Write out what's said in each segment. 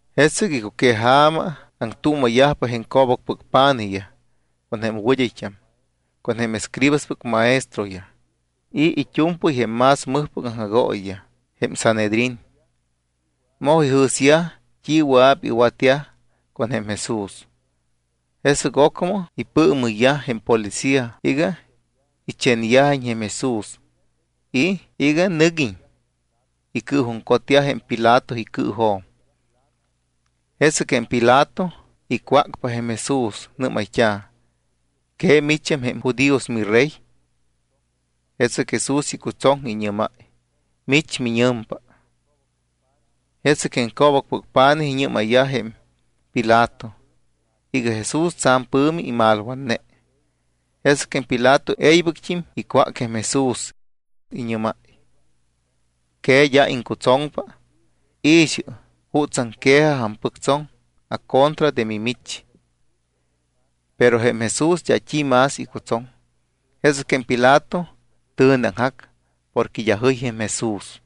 Jesɨc icuqueja̱ma aŋtuuma̱yajpa jém co̱bacpɨc pa̱nijyaj, con jém wɨd́ayt́am, con jém escribaspɨc maestroyaj y it́u̱mpɨy jém más mɨjpɨc aŋjagooyiyaj, jém Sanhedrín. Moj ijɨ̱syaj t́i wɨa̱p iwatyaj con jém Jesús. Jesɨc ocmɨ ipɨɨmɨyyaj jém ipolicía iga ichenyajiñ jém Jesús y iga nɨguiñ icɨɨjuŋcotyaj jém Pilato icɨɨjo̱m. Jesɨc jém Pilato icwácpa jém Jesús. Nɨ́mayt́a̱: —¿Que micham jém judíos miRey? Jesɨc Jesús icutsoŋ, iñɨ́máy: —Mich miñɨmpa. Jesɨc jém co̱bacpɨc pa̱nijyaj iñɨ́mayyaj jém Pilato iga Jesús tsa̱m pɨ̱mi imalwatne. Jesɨc jém Pilato e̱ybɨct́im icwác jém Jesús. Iñɨ́máy: —¿Que d́a iŋcutsoŋpa? I̱xɨ jutsaŋ quejaj ampɨctsoŋ acontra de mimich. Pero jém Jesús d́a t́i más icutsoŋ. Jesɨc jém Pilato tɨ̱neaŋjac porque d́a jɨy jém Jesús.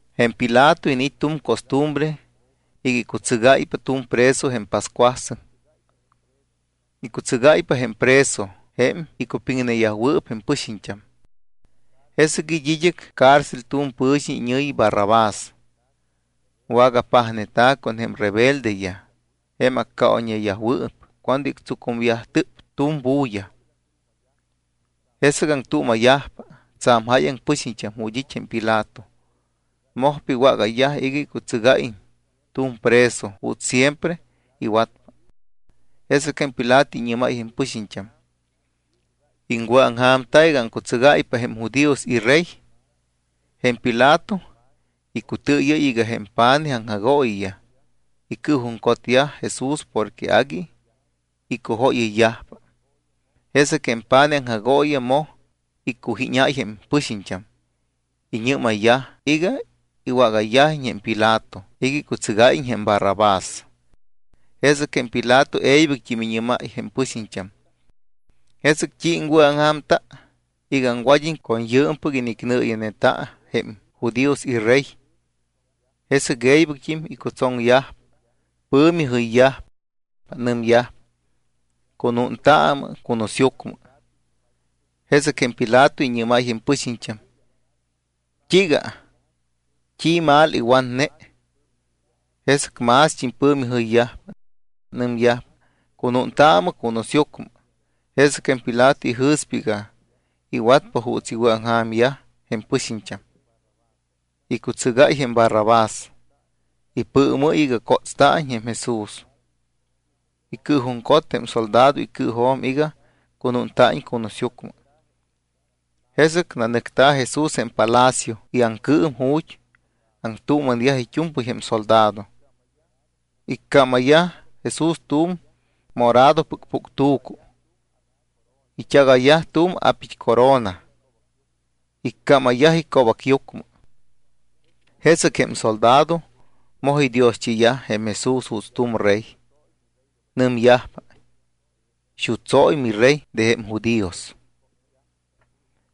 Jém Pilato iniit́ tu̱m costumbre iga icutsɨgáypa tu̱m preso jém pascuasɨŋ. Icutsɨgáypa jém preso jém icupiŋneyajwɨɨp jém pɨxiñt́am. Jesɨc it́ id́ɨc cárcel tu̱m pɨ̱xiñ iñɨ̱yi Barrabás. Wagapajneyajta̱ con jém rebeldeyaj jém accaoyñeyajwɨɨp cuando ictsucumyajtɨp tu̱m bulla. Jesɨc aŋtuuma̱yajpa tsa̱m jáyaŋ pɨxiñt́am ju̱t́ it́ jém Pilato, mojpa iwágayyaj iga icutsɨgáyiñ tu̱m preso juuts siempre iwatpa. Jesɨc jém Pilato iñɨ́máy jém pɨxiñt́am: —¿Iŋwɨ̱aŋja̱mta iga aŋcutsɨgáypa jém judíos iRey? Jém Pilato icutɨɨyɨ́y iga jém pa̱nij aŋjagooyiyaj icɨɨjuŋcotyaj Jesús porque agui icujóyɨyyajpa. Jesɨc jém pa̱nij aŋjagooyiyaj moj iccujíñayyaj jém pɨxiñt́am. Iñɨ́mayyaj iga iwágáyiñ jém Pilato iga icutsɨgáyiñ jém Barrabás. Jesɨc jém Pilato e̱ybɨct́im iñɨ́máy jém pɨxiñt́am: —¿Jesɨc t́i iŋwɨ̱aŋja̱mta iga aŋwad́iñ con yɨɨmpɨc inicnɨɨya̱neta jém judíos iRey? Jesɨc e̱ybɨct́im icutsoŋyajpa. Pɨ̱mi jɨyyajpa. Nɨmyajpa: —¡Cunuuntaamɨ cunusyucmɨ! Jesɨc jém Pilato iñɨ́máy jém pɨxiñt́am: —¿T́iiga? ¿T́i mal iwatne? Jesɨc mást́im pɨ̱mi jɨyyajpa. Nɨmyajpa: —¡Cunuuntaamɨ cunusyucmɨ! Jesɨc jém Pilato ijɨ̱spa iga iwatpa juuts iwɨ̱aŋja̱myaj jém pɨxiñt́am, icutsɨgáy jém Barrabás. Ipɨɨmɨ́y iga cótsta̱iñ jém Jesús, icɨɨjuŋcot jém soldado icɨɨjo̱m iga cunúnta̱iñ cunusyucmɨ. Jesɨc nanɨcta̱ Jesús jém palacio iaŋcɨɨm ju̱t́ aŋtuuma̱neyaj it́u̱mpɨy jém soldado. Iccámayyaj Jesús tu̱m moradopɨc puctu̱cu. It́agayyaj tu̱m a̱pit́corona, iccámayyaj ico̱bacyucmɨ. Jesɨc jém soldado moj idioschiyaj jém Jesús juuts tu̱m rey. Nɨmyajpa: —Xutsóy miRey de jém judíos.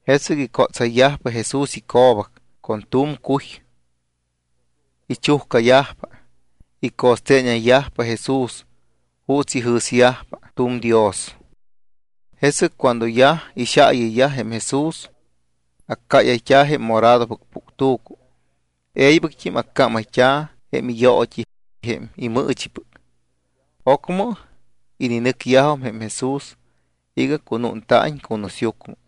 Jesɨc icótsayyajpa Jesús ico̱bac con tu̱m cuy. Ichujcayajpa. Ico̱steeñayyajpa Jesús juuts ijɨ̱syajpa tu̱m dios. Jesɨc cuando yaj ixaayɨyyaj jém Jesús, accáyayt́a̱ jém moradopɨc puctu̱cu, e̱ybɨct́im accámayt́a̱ jém iyoot́i jém imɨɨchipɨc. Ocmɨ ininɨcyajum jém Jesús iga cunúnta̱iñ cunusyucmɨ.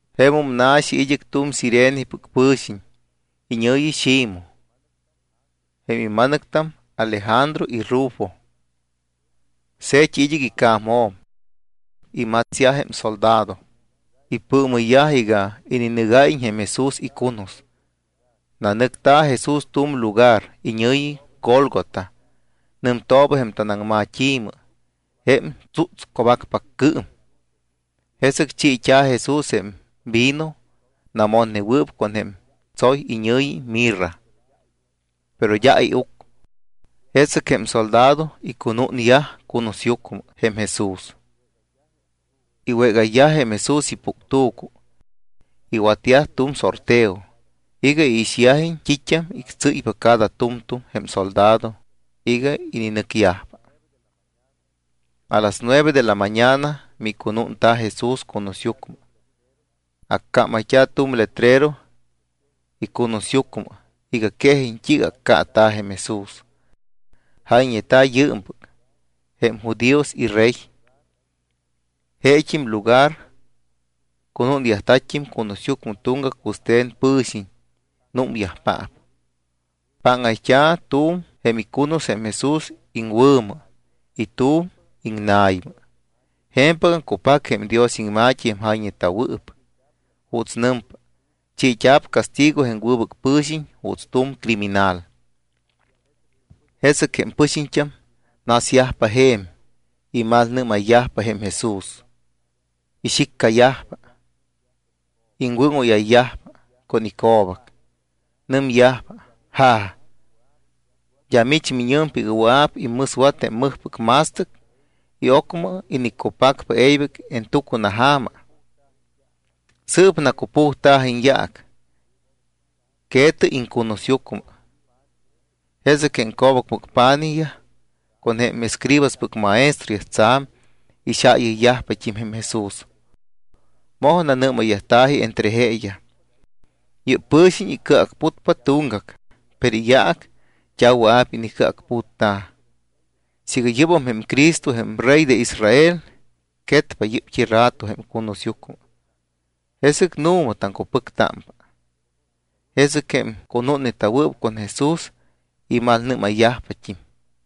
Jemum na̱xi id́ɨc tu̱m Cirenepɨc pɨ̱xiñ iñɨ̱yi Ximoj. Jém ima̱nɨctam Alejandro y Rufo. Se̱t́i id́ɨc ica̱mjo̱m. Imatsyaj jém soldado, ipɨɨmɨyyaj iga ininɨgáyiñ jém Jesús icunus. Nanɨcta̱ Jesús tu̱m lugar iñɨ̱yi Gólgota. Nɨmtooba jém tanaŋmat́i̱mɨ, jém Tsútsco̱bacpaccɨɨm. Jesɨc chiit́a̱ Jesús jém vino namotneta̱wɨɨp con jém tsoy iñɨ̱yi mirra. Pero d́a iuc. Jesɨc jém soldado icunúnyaj cunusyucmɨ jém Jesús. Iwégayyaj jém Jesús ipuctu̱cu. Iwatyaj tu̱m sorteo iga iixyajiñ t́it́am ictsɨ́ypa cada tu̱mtu̱m jém soldado iga ininɨcyajpa. A las nueve de la mañana micunúnta̱ Jesús cunusyucmɨ. Accámayt́a̱ tu̱m letrero icunusyucmɨ iga quejiñ t́iiga accaata̱ jém Jesús. Jayñeta̱ yɨɨmpɨc: “Jém judíos iRey.” Jeet́im lugar cunúnyajta̱t́im cunusyucmɨ tuŋgac wɨste̱n pɨ̱xiñ, númyajpaap. Páŋayt́a̱ tu̱m jém icunus jém Jesús iŋwɨ̱mɨ y tu̱m iŋna̱ymɨ. Je̱mpɨgam cupac jém Dios iŋma̱t́i jém jayñeta̱wɨɨp juuts nɨmpa: “Chiit́a̱p castigo jém wɨbɨc pɨ̱xiñ juuts tu̱m criminal.” Jesɨc jém pɨxiñt́am nasyajpa je̱m, imalmalnɨ́mayyajpa jém Jesús. Ixiccayajpa. Iŋwɨ́ŋóyayyajpa con ico̱bac. Nɨmyajpa: —Ja̱, ¿d́a mich miñɨmpa iga wɨa̱p immɨswat jém mɨjpɨc ma̱stɨc y ocmɨ iniccupacpa e̱ybɨc en tucunaja̱ma? Sɨɨp nacupujta̱jɨ iñyaac. Que̱tɨ iŋcunusyucmɨ. Jesɨc jém co̱bacpɨc pa̱nijyaj con jém escribaspɨc maestroyaj tsa̱m ixaayɨyyajpat́im jém Jesús. Moj nanɨ́mayyajta̱ji entre jeeyaj: —Yɨ́p pɨ̱xiñ icɨacputpa tuŋgac, pero iyaac d́a wɨa̱p inicɨacputta̱. Siiga yɨ́bam jém Cristo jém Rey de Israel, quetpa yɨ́pt́i rato jém icunusyucmɨ, jesɨc nu̱ma taŋcupɨctámpa. Jesɨc jém cunúnneta̱wɨɨp con Jesús imalnɨ́mayyajpat́im.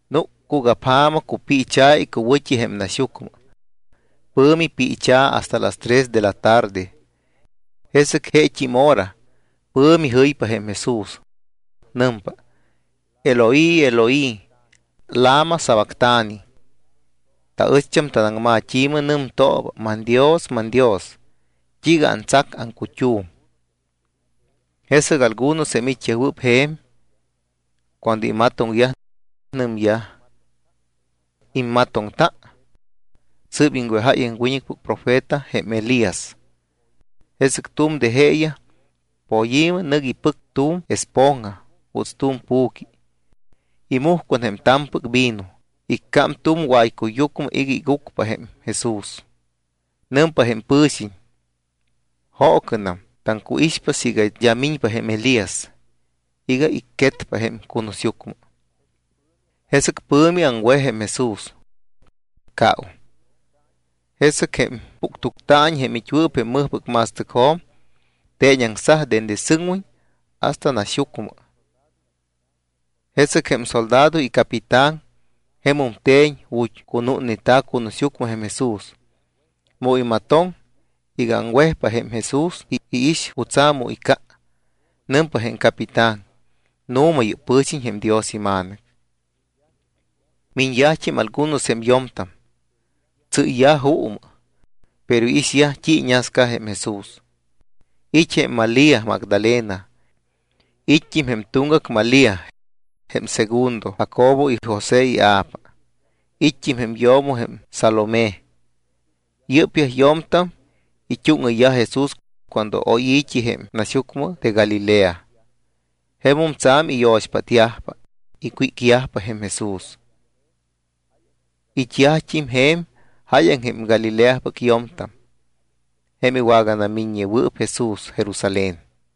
Núc cugapja̱ma. Cupiicha̱ icuwɨ̱t́i jém naxyucmɨ. Pɨ̱mi piichɨ hasta las tres de la tarde. Jesɨc jeet́im hora pɨ̱mi jɨypa jém Jesús. Nɨmpa: —Eloi, Eloi, ¿lama sabactani? Taɨcht́am tanaŋmat́i̱mɨ nɨmtooba: ManDios, manDios, ¿t́iiga antsac aŋcut́um? Jesɨc algunos jém it́yajwɨɨp je̱m, cuando imatoŋyaj, nɨmyaj: —¿Immatoŋta? Sɨɨp iŋwejáy jém wiñɨcpɨc profeta jém Elías. Jesɨc tu̱m de jeeyaj poyi̱mɨ nɨc ipɨc tu̱m esponja juuts tu̱m pu̱qui, imuj con jém ta̱mpɨc vino, iccám tu̱m waycuyyucmɨ iga igucpa jém Jesús. Nɨmpa jém pɨ̱xiñ: —Joocɨnam, taŋcuixpa siiga d́a miñpa jém Elías iga icquetpa jém cunusyucmɨ. Jesɨc pɨ̱mi aŋwej jém Jesús, caum. Jesɨc jém puctuctaañi jém it́wɨɨp jém mɨjpɨc ma̱stɨcjo̱m teeñaŋsaj dende sɨŋwiñ hasta naxyucmɨ. Jesɨc jém soldado icapitán jemum te̱ñ ju̱t́ cunúnneta̱ cunusyucmɨ jém Jesús. Mu imatoŋ iga aŋwejpa jém Jesús y iix jutsa̱ mu icca, nɨmpa jém capitán: —Nu̱ma, yɨ́p pɨ̱xiñ jém Dios iMa̱nɨc. Miñyajt́im algunos jém yo̱mtam, tsɨ́yyaj juumɨ, pero iixyaj t́i iñasca jém Jesús. It́ jém Malía Magdalena. It́t́im jém tuŋgac Malía jém segundo Jacobo y José ia̱pa. It́t́im jém yo̱mo jém Salomé. Yɨ́pyaj yo̱mtam it́úŋɨyyaj Jesús cuando oy i̱t́i jém naxyucmɨ de Galilea. Jemum tsa̱m iyo̱xpátyajpa, icwícyajpa jém Jesús. It́yajt́im je̱m jáyaŋ jém Galileapɨc yo̱mtam jém iwaganamiññewɨɨp Jesús Jerusalén.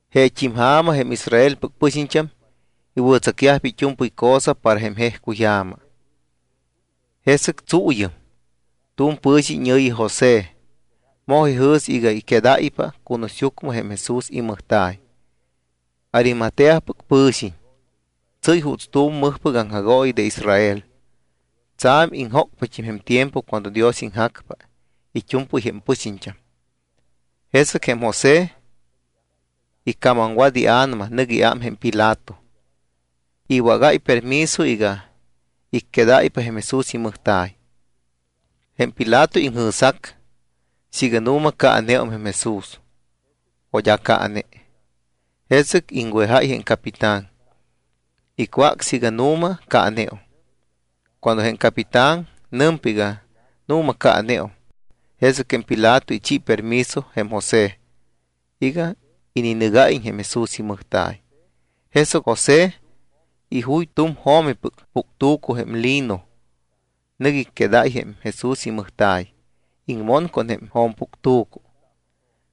Jeet́im ja̱ma jém Israelpɨc pɨxiñt́am iwɨ̱tsacyajpa it́u̱mpɨy cosa para jém jejcuyja̱ma. Jesɨc tsuuyɨm tu̱m pɨ̱xiñ iñɨ̱yi José moj ijɨ̱s iga icquedáypa cunusyucmɨ jém Jesús imɨjta̱y. Arimateapɨc pɨ̱xiñ, tsɨ́y juuts tu̱m mɨjpɨc aŋjagooyi de Israel. Tsa̱m iŋjócpat́im jém tiempo cuando Dios iŋjacpa it́u̱mpɨy jém pɨxiñt́am. Jesɨc jém José icamamwat ia̱nama, nɨc iám jém Pilato, iwágáypa permiso iga icquedáypa jém Jesús imɨjta̱y. Jém Pilato iŋjɨ̱sjac siiga nu̱ma caaneum jém Jesús o d́a caane. Jesɨc iŋwejáy jém capitán, icwác siiga nu̱ma caaneum. Cuando jém capitán nɨmpa iga nu̱ma caaneum, jesɨc jém Pilato ichi permiso jém José iga ininɨgáyiñ jém Jesús imɨjta̱y. Jesɨc José ijuy tu̱m jo̱mipɨc puctu̱cu, jém lino. Nɨc icquedáy jém Jesús imɨjta̱y, iŋmon con jém jo̱mpuctu̱cu,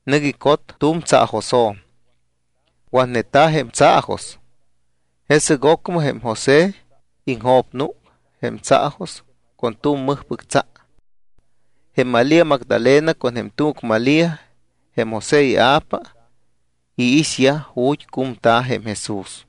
nɨc icot tu̱m tsaajosjo̱m. Watneta̱ jém tsaajos. Jesɨc ocmɨ jém José iŋjo̱pnúc jém tsaajos con tu̱m mɨjpɨc tsa. Jém Malía Magdalena con jém tuŋgac Malía, jém José ia̱pa, iixyaj ju̱t́ cumta̱ jém Jesús.